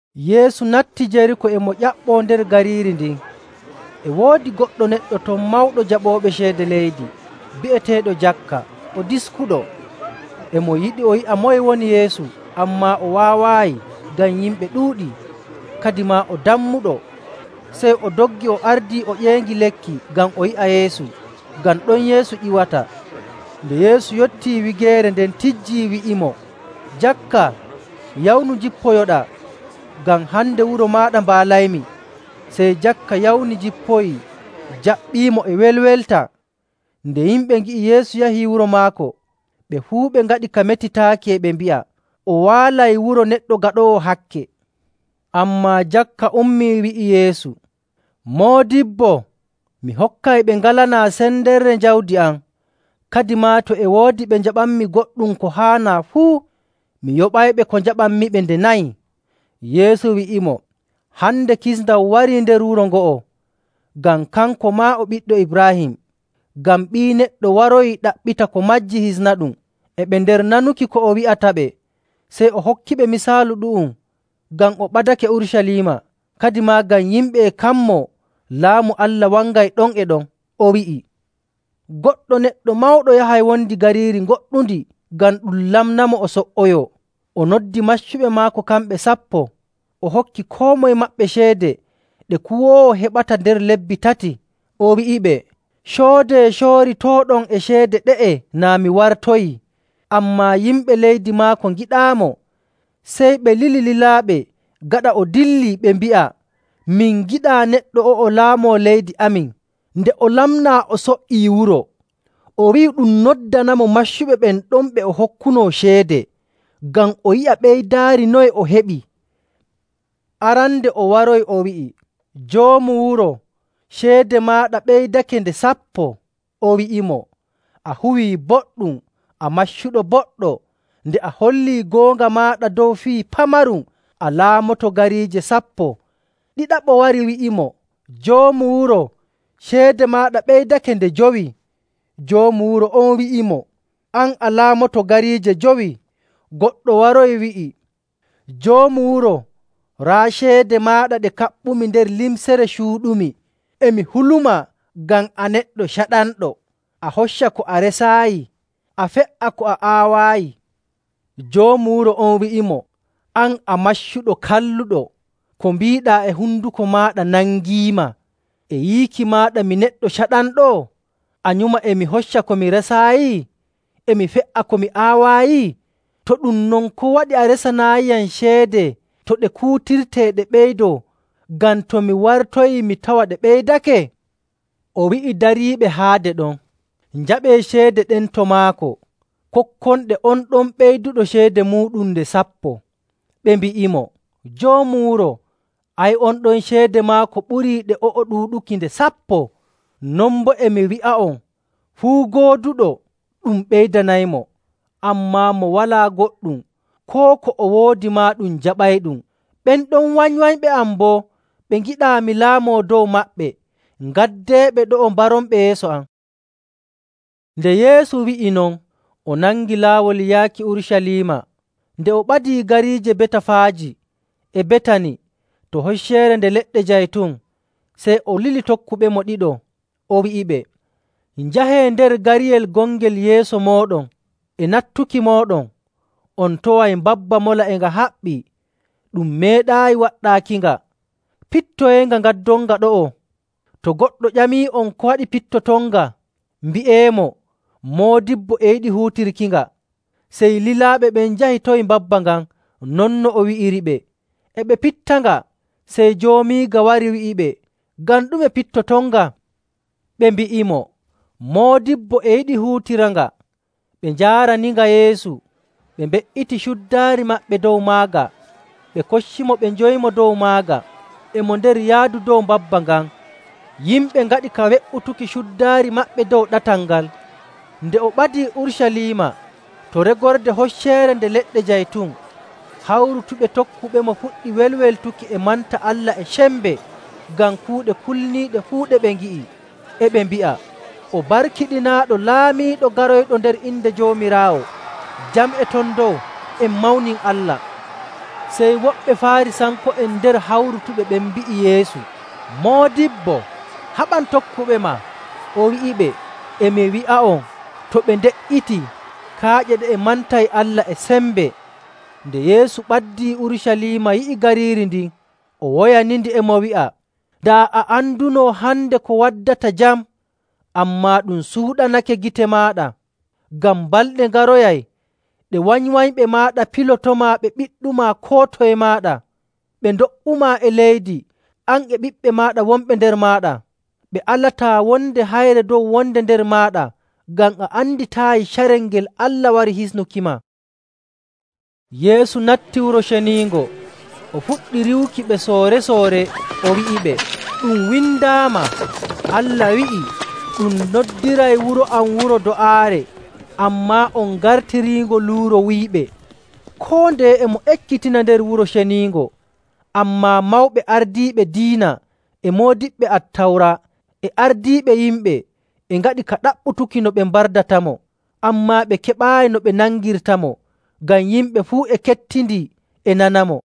Yeesu natti Jeriiko e mo ƴaɓɓoo nder gariiri ndin. E woodi goɗɗo neɗɗo ton mawɗo jaɓooɓe ceede leydi, bi'eteeɗo Jakka, o diskuɗo. E mo yiɗi o yi'a moye woni Yeesu, ammaa o waawaayi ngam yimɓe ɗuuɗii, kadimaa o dammuɗo. Sey o doggi o ardii o ƴeeŋi lekki ngam o yi'a Yeesu, ngam ɗon Yeesu ƴiwata. Nde Yeesu yottii wigeere nden tijjii wi'imo, “Jakka, yawnu njippoyoɗaa ngam hande wuro maaɗa mbaalaymi.” Sey Jakka yawni, jippoyii, jaɓɓiimo e welwelta. Nde yimɓe ngi'i Yeesu yahi wuro maako, ɓe fuu ɓe ngaɗi ka metitaaki e ɓe mbi'a, “O waalay wuro neɗɗo gaɗoowo hakke.” Ammaa Jakka ummii wi'i Yeesu, “Moodibbo, mi hokkay ɓe ngalanaa sendere jawdi am. Kadimaa to e woodi ɓe njaɓanmi goɗɗum ko haanaa fuu, mi yoɓayɓe ko njaɓanmiɓe nde nayi.” Yeesu wi'imo, “Hande kisndam warii nder wuro ngo'o, ngam kanko maa o ɓiɗɗo Ibraahim. Ngam Ɓii Neɗɗo waroyii ɗaɓɓita ko majji hisnaɗum.”. E ɓe nder nanuki ko o wi'ataɓe, sey o hokkiɓe misaalu ɗu'um ngam o ɓadake Urucaliima, kadimaa ngam yimɓe e kammoo Laamu Allah wangay ɗon e ɗon. O wi'i, “Goɗɗo neɗɗo mawɗo yahay wondi gariiri goɗɗundi ngam ɗum lamnamo o so''oyoo. O noddi maccuɓe maako kamɓe sappo, o hokki koo moye maɓɓe ceede ɗe kuwoowo heɓata nder lebbi tati, o wi'iɓe, ‘Coodee cooritooɗon e ceede ɗe'e naa mi wartoyii.’ Ammaa yimɓe leydi maako ngiɗaamo, sey ɓe lili lilaaɓe gaɗa o dillii ɓe mbi'a, ‘Min ngiɗaa neɗɗo o'o laamoo leydi amin.’ “Nde o lamnaa o so''ii wuro, o wi'i ɗum noddanamo maccuɓe ɓen ɗon ɓe o hokkunoo ceede, ngam o yi'a ɓeydaari noye o heɓi. Arandeejo on waroyi wi'i, ‘Joomu wuro, ceede maaɗa ɓeydake nde sappo.’ O wi'imo, ‘A huwii boɗɗum, a maccuɗo boɗɗo. Nde a hollii goonga maaɗa dow fii pamarum, a laamoto gariije sappo.’ Ɗiɗaɓo wari, wi'imo, ‘Joomu wuro, ceede maaɗa ɓeydake nde jowi.’ Joomu wuro on wi'imo, ‘An, a laamoto gariije jowi.’ Goɗɗo waroyi wi'i, ‘Joomu wuro, raa ceede maaɗa ɗe kaɓɓumi nder limcere cuuɗumi. E mi hulumaa ngam a neɗɗo caɗanɗo; a hocca ko a resaayi, a fe''a ko a aawaayi.’ Joomu wuro on wi'imo, ‘An, a maccuɗo kalluɗo. Ko mbiiɗaa e honduko maaɗa nangiima! E yiiki maaɗa mi neɗɗo caɗanɗo? A nyuma e mi hocca ko mi resaayi, e mi fe''a ko mi aawaayi? To ɗum non, ko waɗi a resanaayiyam ceede to ɗe kuutirtee ɗe ɓeydoo,: Waato banki. (E) ngam to mi wartoyii mi tawa ɗe ɓeydake?’ O wi'i dariiɓe haade ɗon, ‘Njaɓee ceede ɗen to maako, kokkonɗe on ɗon ɓeyduɗo ceede muuɗum nde sappo.’ Ɓe mbi'imo, ‘Joomu wuro, ay on ɗon ceede maako ɓurii ɗe o'o ɗuuɗuki nde sappo.’ ‘Non boo e mi wi'a'on, fuu gooduɗo ɗum ɓeydanaymo. Ammaa mo walaa goɗɗum, koo ko o woodi maa ɗum jaɓayɗum.. Ɓen ɗon wanywanyɓe am boo ɓe ngiɗaa mi laamoo dow maɓɓe, ngaddeeɓe ɗo'o, mbaronɓe yeeso am.’” Nde Yeesu wi'i non, o nangi laawol yaaki Urucaliima. Nde o ɓadii gariije Betafaaji e Betani to Hocceere Nde Leɗɗe Jaytun, sey o lili tokkuɓemo ɗiɗo. O wi'iɓe, “Njahee nder gariyel gongel yeeso mooɗon. E nattuki mooɗon, on taway mbabba mola e nga haɓɓii, ɗum meeɗaayi waɗɗaakinga. Pittoyeenga ngaddonnga ɗo'o. To goɗɗo ƴamii'on ko waɗi pittotonnga, mbi'eemo, ‘Moodibbo e yiɗi huutirkinga.’” Sey lilaaɓe ɓen njahi tawi mbabba ngan non no o wi'iriɓe. E ɓe pittanga, sey joomiiga wari wi'iɓe, “Ngam ɗume pittotonnga?” Ɓe mbi'imo, “Moodibbo e yiɗi huutiniranga.” Ɓe njaaraninga Yeesu, ɓe mbe''iti cuddaari maɓɓe dow magga, ɓe koccimo ɓe njowimo dow maaga. E mo nder yaadu dow mbabba ngan, yimɓe ngaɗi ka we''utuki cuddaari maɓɓe dow ɗatal ngal. Nde o ɓadii Urucaliima to regorde Hocceere Nde Leɗɗe Jaytun, hawrutuɓe tokkuɓemo puɗɗi welweltuki e manta Allah e sembe ngam kuuɗe kulniiɗe fuu ɗe ɓe ngi'i. E ɓe mbi'a, “O barkiɗinaaɗo Laamiiɗo garoyɗo nder inde Joomiraawo! Jam e ton dow, en mawnin Allah!”. Sey woɓɓe Faarisanko'en nder hawrutuɓe ɓen mbi'i Yeesu, “Moodibbo, haɓan tokkuɓema.” O wi'iɓe, “E mi wi'a'on, to ɓe nde''itii, kaaƴe ɗe'e mantay Allah e sembe.” Nde Yeesu ɓaddii Urucaliima yi'i gariiri ndin, o woyanindi, e mo wi'a, “Daa a anduno hande ko waddata jam! Ammaa ɗum suuɗanake gite maaɗa. Ngam balɗe ngaroyay ɗe wanywanyɓe maaɗa pilotomaa ɓe ɓiɗɗumaa koo toye maaɗa, ɓe ndo''umaa e leydi, an e ɓiɓɓe maaɗa wonɓe nder maaɗa, ɓe alataa wonde hayre dow wonde nder maaɗa, ngam a anditaayi carel ngel Allah wari hisnukima.” Yeesu natti Wuro Ceniingo, o fuɗɗi riiwuki ɓe soore‑soore, o wi'iɓe, “Ɗum windaama Allah wi'i, ‘Ɗum noddiray wuro am wuro do'aare,’ ammaa on ngartiriingo luuro wuyɓe.”. Koo ndeye e mo ekkitina nder Wuro Ceniingo, ammaa mawɓe ardiiɓe diina e moodiɓɓe Attawra e ardiiɓe yimɓe e ngaɗi ka ɗaɓɓutuki no ɓe mbardatamo.. Ammaa ɓe keɓaayi no ɓe nangirtamo, ngam yimɓe fuu e kettindi e nanamo.